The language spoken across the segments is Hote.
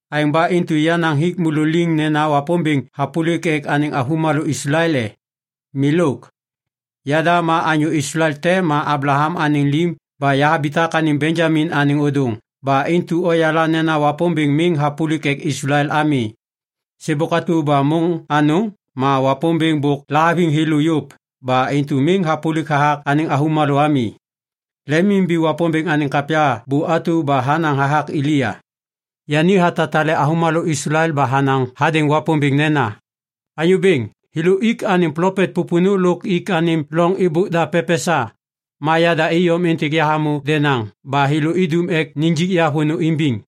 Aêŋ ba intu yahanaŋ hik môlô liŋ nena Wapômbêŋ hapôlik ek anêŋ avômalô Islael e? Milôk. Yada ma anyô Islael te ma Ablaham anêŋ lim ba yahabitak anêŋ Benjamin anêŋ ôdôŋ ba intu oyala nena Wapômbêŋ miŋ hapôlik ek Islael ami. Sêbôk atu ba môŋ anôŋ ma Wapômbêŋ bôk lahaviŋ thêlô yôv ba intu miŋ hapôlik hathak anêŋ avômalô ami. Lemimimbi Wapômbêŋ anêŋ kapya bu atu ba hanaŋ hathak Elia. Yani hatatale avômalô Islael ba hanaŋ hadêŋ Wapômbêŋ nena, “Anyô Bêŋ, thêlô ik anêm plopet pôpônô lôk ik anêm loŋ êbôk da pepesa. Ma yada iyom êntêk yahamô denaŋ ba thêlô idum ek nijik ya vônô imbiŋ.”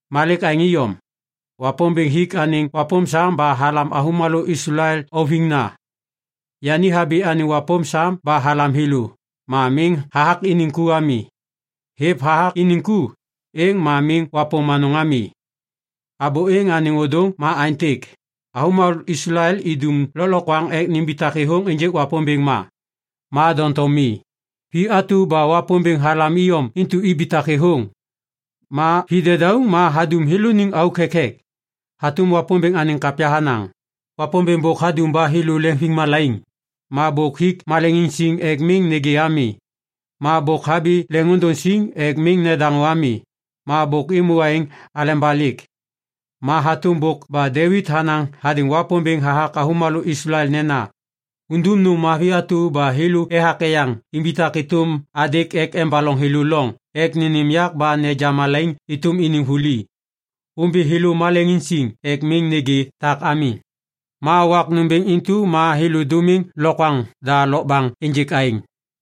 Ma lêk aêŋ iyom, Wapômbêŋ hik anêŋ wapôm sam ba halam avômalô Islael auviŋna. Yani habi anêŋ wapôm sam ba halam thêlô. Ma miŋ hathak iniŋ ku ami. Hêv hathak iniŋ ku, êŋ ma miŋ wapôm anôŋ ami. Abô êŋ anêŋ ôdôŋ ma aêntêk. Avômalô Islael idum lôklokwaŋ ek nimbitak thêthôŋ ênjêk Wapômbêŋ ma, ma doŋtom mi. Vi atu ba Wapômbêŋ halam iyom intu ibitak thêthôŋ. Ma vi dedauŋ ma hadum thêlôniŋ auk thekthek. Hatôm Wapômbêŋ anêŋ kapya hanaŋ, “Wapômbêŋ bôk hadum ba thêlô leŋviŋmalaiŋ. Ma bôk hik maleŋiŋ siŋ ek miŋ nêgê ami. Ma bôk habi leŋôndôŋ siŋ ek miŋ nedaŋô ami. Ba bôk êmô aêŋ aleba lêk.” Ma hatôm bôk ba Devit hanaŋ hadêŋ Wapômbêŋ hathak avômalô Islael nena, “Undum nôm mavi atu ba thêlô ethak eyaŋ imbitak êtôm adêk ek embaloŋ thêlô loŋ ek nênêm yak ba neja malaiŋ êtôm iniŋ vuli. Ômbi thêlô maleŋiŋ siŋ ek miŋ nêgê tak ami, ma wak nômbêŋ intu ma thêlô dômiŋ lokwaŋ da lokbaŋ ênjêk aêŋ.”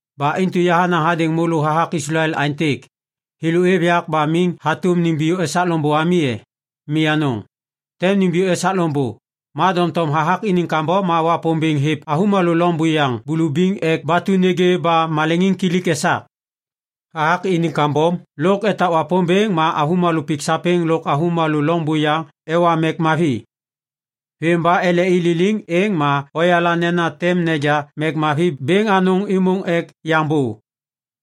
Ba intu yahanaŋ hadêŋ môlô hathak Islael aêntêk. Thêlô êv yak ba miŋ hatôm nimbiyô esak loŋbô ami e? Mi anôŋ, tem nimbiyô esak loŋbô. Ma doŋtom hathak iniŋ kambom ma Wapômbêŋ hêv avômalô loŋ buyaŋ bulubiŋ ek batu nêgê ba maleŋiŋkilik esak. Hathak iniŋ kambom lôk etak Wapômbêŋ ma avômalô pik sapêŋ lôk avômalô loŋ buyaŋ ewa mek mavi. Vêm ba ele i liliŋ, êŋ ma oyala nena tem neja mek mavi bêŋ anôŋ êmôŋ ek yaŋ bô.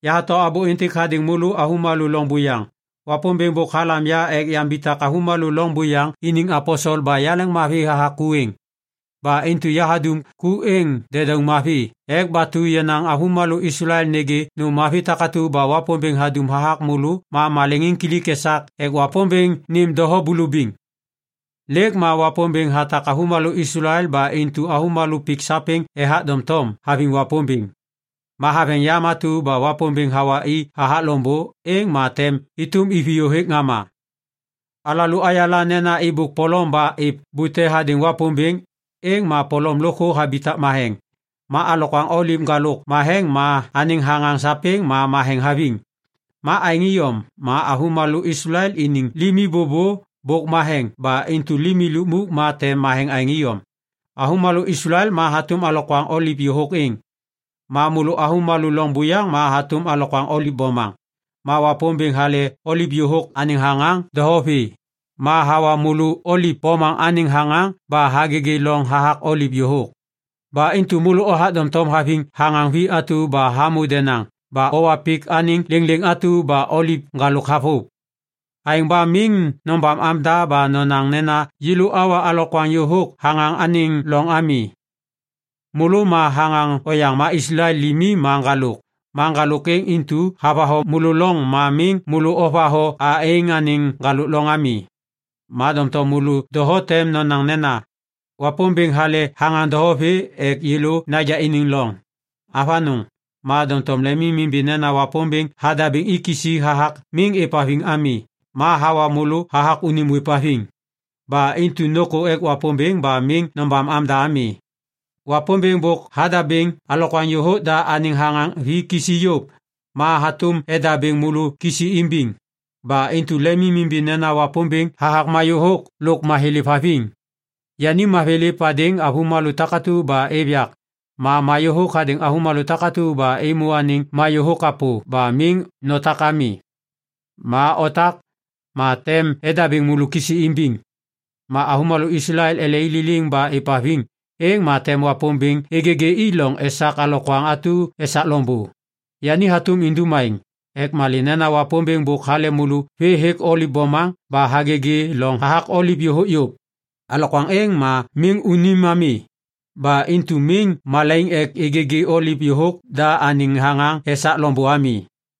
Yahato abô êntêk hadêŋ môlô avômalô loŋ buyaŋ. Wapômbêŋ bôk halam ya ek yambitak avômalô loŋ buyaŋ iniŋ aposel ba yaleŋmavi hathak ku êŋ. Ba intu yahadum ku êŋ dedauŋ mavi ek batu yenaŋ avômalô Islael nêgê nôm mavi takatu ba Wapômbêŋ hadum hathak môlô ba maleŋiŋkilik esak ek Wapômbêŋ nêm doho bulubiŋ. Lêk ma Wapômbêŋ hatak avômalô Islael ba intu avômalô pik sapêŋ ethak doŋtom haviŋ Wapômbêŋ. Ma haveŋ yam atu ba Wapômbêŋ hawa i hathak loŋbô, êŋ ma tem êtôm iviyô hêk ŋama. Alalô ayala nena êbôk polom ba êv bute hadêŋ Wapômbêŋ, êŋ ma polom lôkthô habitak matheŋ. Ma alokwaŋ oliv ŋgalôk matheŋ ma anêŋ thaŋaŋ sapêŋ ma matheŋ haviŋ. Ma aêŋ iyom ma avômalô Islael iniŋ limi bôbô bôk matheŋ ba intu limi lukmuk ma tem matheŋ aêŋ iyom. Avômalô Islael ma hatôm alokwaŋ oliv yôhôk êŋ. Ma môlô avômalô lôŋ buyaŋ ma hatôm alokwaŋ oliv bomaŋ. Ma Wapômbêŋ hale oliv yôhôk anêŋ thaŋaŋ doho vê, ma hawa môlô oliv bomaŋ anêŋ thaŋaŋ ba hagêgê loŋ hathak oliv yôhôk. Ba intu môlô othak doŋtom haviŋ thaŋaŋ vi atu ba hamô denaŋ ba owa pik anêŋ lêŋlêŋ atu ba oliv ŋgalôk havôv. Aêŋ ba miŋ nobam amda ba nonaŋ nena yêlô awa alokwaŋ yôhôk thaŋaŋ anêŋ loŋ ami. Môlô ma thaŋaŋ oyaŋ ma Islael limi ma ŋgalôk, ma ŋgalôk êŋ intu havatho môlô loŋ ma miŋ môlô ovatho a êŋ anêŋ ŋgalôk loŋ ami. Ma doŋtom môlô doho tem nonaŋ nena, “Wapômbêŋ hale thaŋaŋ doho vê ek yêlô naja iniŋ loŋ.” Avanôŋ, ma doŋtom lemimimbi nena Wapômbêŋ hadabêŋ i kisi hathak miŋ êvhaviŋ ami ma hawa môlô hathak unim ôêvhaviŋ. Ba intu nôkô ek Wapômbêŋ ba miŋ nobam amda ami. Wapômbêŋ bôk hadabêŋ alokwaŋ yôhôk da anêŋ thaŋaŋ vi kisi yôv, ma hatôm edabêŋ môlô kisi imbiŋ. Ba intu lemimimbi nena Wapômbêŋ hathak mayôhôk lôk mathêlêv haviŋ. Yani mathêlêv hadêŋ avômalô takatu ba êv yak, ma mayôhôk hadêŋ môlô takatu ba ômô anêŋ mayôhôk kapô ba miŋ notak ami. Ma otak, ma tem edabêŋ môlô kisi imbiŋ. Ma avômalô Islael ele i liliŋ ba êvhaviŋ, êŋ ma tem Wapômbêŋ êgêgê i loŋ esak alokwaŋ atu esak loŋbô. Yani hatôm indum aêŋ. Ek malê nena Wapômbêŋ bôk hale môlô vê hêk oliv bomaŋ ba hagêgê loŋ hathak oliv yôhôk yôv. Alokwaŋ êŋ ma miŋ unim ami. Ba intu miŋ malaiŋ ek êgêgê oliv yôhôk da anêŋ thaŋaŋ esak loŋbô ami.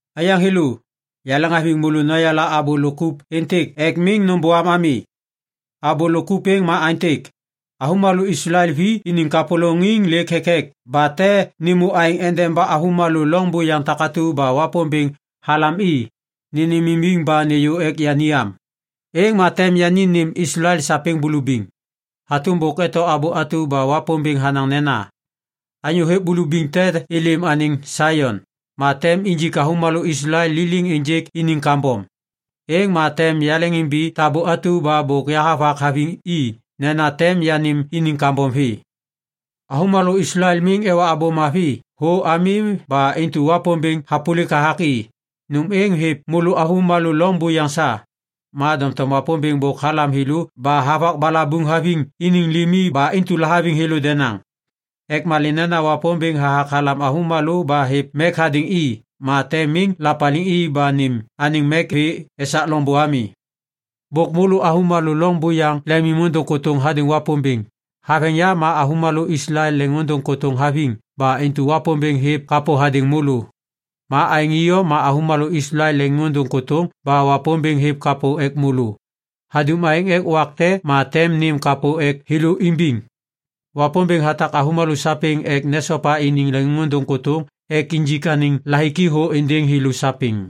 Aiyaŋ thêlô, yaleŋhaviŋ môlô noyala abô lôk kup êntêk ek miŋ nômbôam ami. Abô lôk kup êŋ ma aêntêk. Avômalô Islael vi iniŋ kapôlôŋiŋ lêk thekthek ba tem nêmô aêŋ endeba avômalô lôŋ buyaŋ takatu ba Wapômbêŋ halam i, nênêmimbiŋ ba nêyô ek yani am. Êŋ ma tem yani nêm Islael sapêŋ bulubiŋ. Hatôm bôk eto abô atu ba Wapômbêŋ hanaŋ nena, “Anyô hêv bulubiŋ tem êlêm anêŋ Saion, ma tem injik avômalô Islael liliŋ ênjêk iniŋ kambom. Êŋ ma tem yaleŋimbi tabô atu ba bôk yahavak haviŋ i nena tem yanêm iniŋ kambom vê.” Avômalô Islael miŋ ewa Abô Mavi thô ami ba intu Wapômbêŋ hapôlik hathak i. Nôm êŋ hêv môlô avômalô loŋ buyaŋ sa. Ma doŋtom Wapômbêŋ bôk halam thêlô ba havak balabuŋ haviŋ iniŋ limi ba intu lahaviŋ thêlô denaŋ. Ek malê nena Wapômbêŋ hathak halam avômalô ba hêv mek hadêŋ i ma tem miŋ lapaliŋ i ba nêm anêŋ mek vê esak loŋbô ami. Bôk môlô avômalô loŋ buyaŋ lemimôndôŋ kôtôŋ hadêŋ Wapômbêŋ. Haveŋ yam ma avômalô Islael leŋiŋôndôŋ kôtôŋ haviŋ ba intu Wapômbêŋ hêv kapô hadêŋ môlô. Ma aêŋ iyom ma avômalô Islael lêk leŋiŋôndôŋ kôtôŋ ba Wapômbêŋ hêv kapô ek môlô. Hadum aêŋ ek wak te ma tem nêm kapô ek thêlô imbiŋ. Wapômbêŋ hatak avômalô sapêŋ ek nesopa iniŋ leŋiŋôndôŋ kôtôŋ ek injik anêŋ lahiki thô êndêŋ thêlô sapêŋ.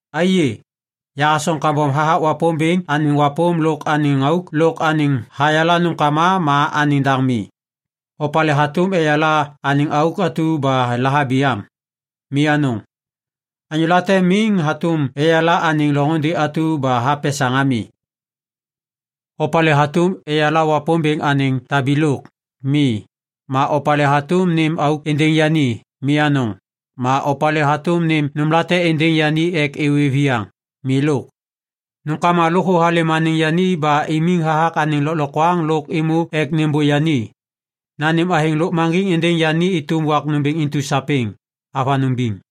Aiyê, yahasoŋ kambom hathak Wapômbêŋ anêŋ wapôm lôk anêŋ auk lôk anêŋ hayala nômkama ma anêŋ daŋ mi! Opalê hatôm eyala anêŋ auk atu ba lahabi am? Mi anôŋ. Anyô late miŋ hatôm eyala anêŋ loŋôndê atu ba hapesaŋ ami. Opalê hatôm eyala Wapômbêŋ anêŋ tabilôk? Mi. Ma opalê hatôm nêm auk êndêŋ yani? Mi anôŋ. Ma opalê hatôm nêm nômlate êndêŋ yani ek êwê viyaŋ. Milôk! Nômkama lôkthô halêm anêŋ yani ba imiŋ hathak anêŋ lôklokwaŋ lôk êmô ek nêmbô yani. Nanêm athêŋ lôkmaŋgiŋ êndêŋ yani êtôm wak nômbêŋ intu sapêŋ. Avanôŋ biŋ.